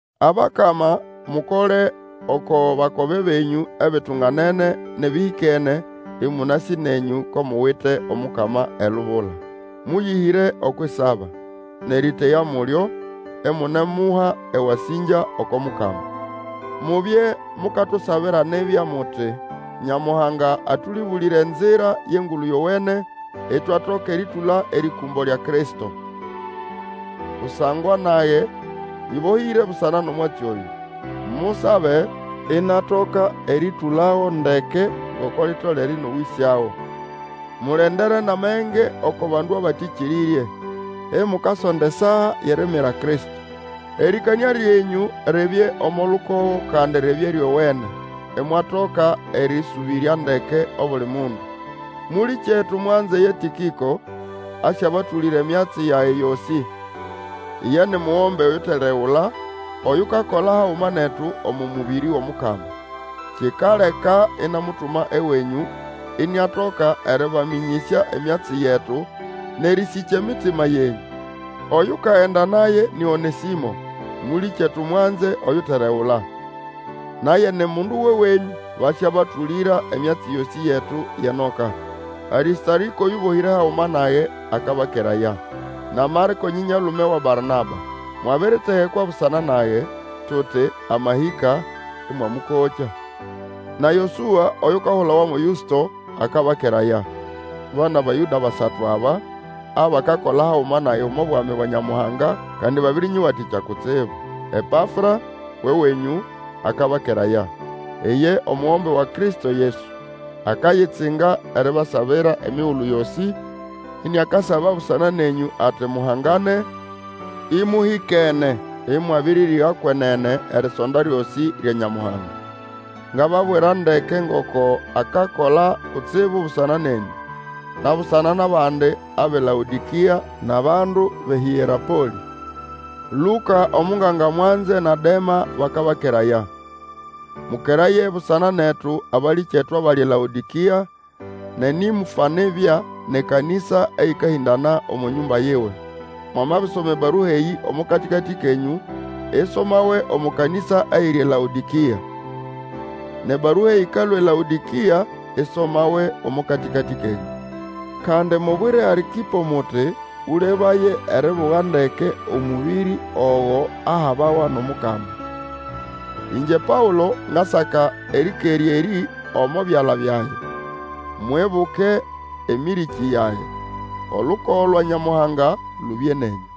Abakama, mukole oko bakobe benyũ ebitunganene nʼebĩhĩkene, ĩmũnasĩ nenyũ ko muwite Omukama elubula. Mũyĩhĩre okwʼisaba, nʼerĩteya mulyo, imunemuha ewasĩngya oko Mukama. Mubye mukatusabira nibya, muti, Nyamuhanga atũlĩbũlĩre enzira yʼEngulu Yowene, itwatoka erĩtũla erĩkũmbo lya Kristo. Kusangwa nage nyĩbohĩre busana nʼomwatsi oyũ. Musabe inatoka erĩtũlago ndeke ngoko litolere nʼerĩowĩsyago. Mulendere nʼamenge oko bandu abatĩkĩrĩrye, imukasonda esaa yʼeriimira Kristo. Erĩkanĩa lyenyũ libye omo lukogo kandi ribye ryowene, imwatoka erĩsũbĩrya ndeke obuli mundu. Mũlĩkyetu mwanze ye Tĩkĩko, asyabatũlĩra emyatsi yage yosĩ. Iye ni, mugombe uteregula, oyukakola haguma netu omo mũbĩrĩ wʼOmukama. Kikaleka inamutuma ewenyũ iniatoka erĩbamĩnyĩsya emyatsi yetu, nʼerĩsĩkya emitima yenyũ. Oyukagenda naye ni Onesĩmo, mũlĩkyetu mwanze oyuteregula. Naye ni mundu wʼewenyũ. Basyabatũlĩra emyatsi yosĩ yetu yʼenoka. Arĩstarĩko, oyũbohĩre haguma nage, akabakeraya. Na Marĩko, nyĩnyaĩlume wa Barnaba. Mwabiritegekwa busana naye, tuti, Amahĩka, ĩmwamũkokya. Na Yosũa, oyukahulawa mo Yũsto, akabakeraya. Ba nʼAbayũda basatu aba abakakola haguma nage omo Bwami bwa Nyamuhanga, kandi babĩrĩnyĩwatĩkya kutsibu. Epafra, wʼewenyũ, akabakeraya, lye omugombe wa Kristo Yesu. Akayitsinga eribasabira emigulu yosĩ, iniakasaba busana nenyũ ati muhangane, ĩmũhĩkene, ĩmwabĩrĩrĩga kwenene erisonda lyosĩ lya Nyamuhanga. Ngababwira ndeke ngoko akakola kutsibu busana nenyũ, na busana nʼabandi abʼeLaodĩkĩa nʼabandu bʼeHĩerapolĩ. Lũka, omunganga mwanze, na Dema bakabakeraya. Mũkeraye busana netu abalĩkyetu abali eLaodokĩa, na Nĩmfa nibya, nʼekanĩsa eyĩkahĩndana omo nyũmba yiwe. Mwamabisoma ebarua eyĩ omo katĩkatĩ kenyũ, isomawe omo kanĩsa eyiri eLaodĩkĩa. Nʼebarua ĩkalũa eLaodĩkĩa isomawe omo katĩkatĩ kenyũ. Kandi mubwire Arkĩpo muti Ũlebaye eribuga ndeke omũbĩrĩ ogo ahabawa nʼOmukama. Ĩngye Paũlo, ngasaka erĩkerya erĩ omo byala byage. Mwibuke emĩrĩkĩ yage! Olukogo lwa Nyamuhanga lubye nenyũ.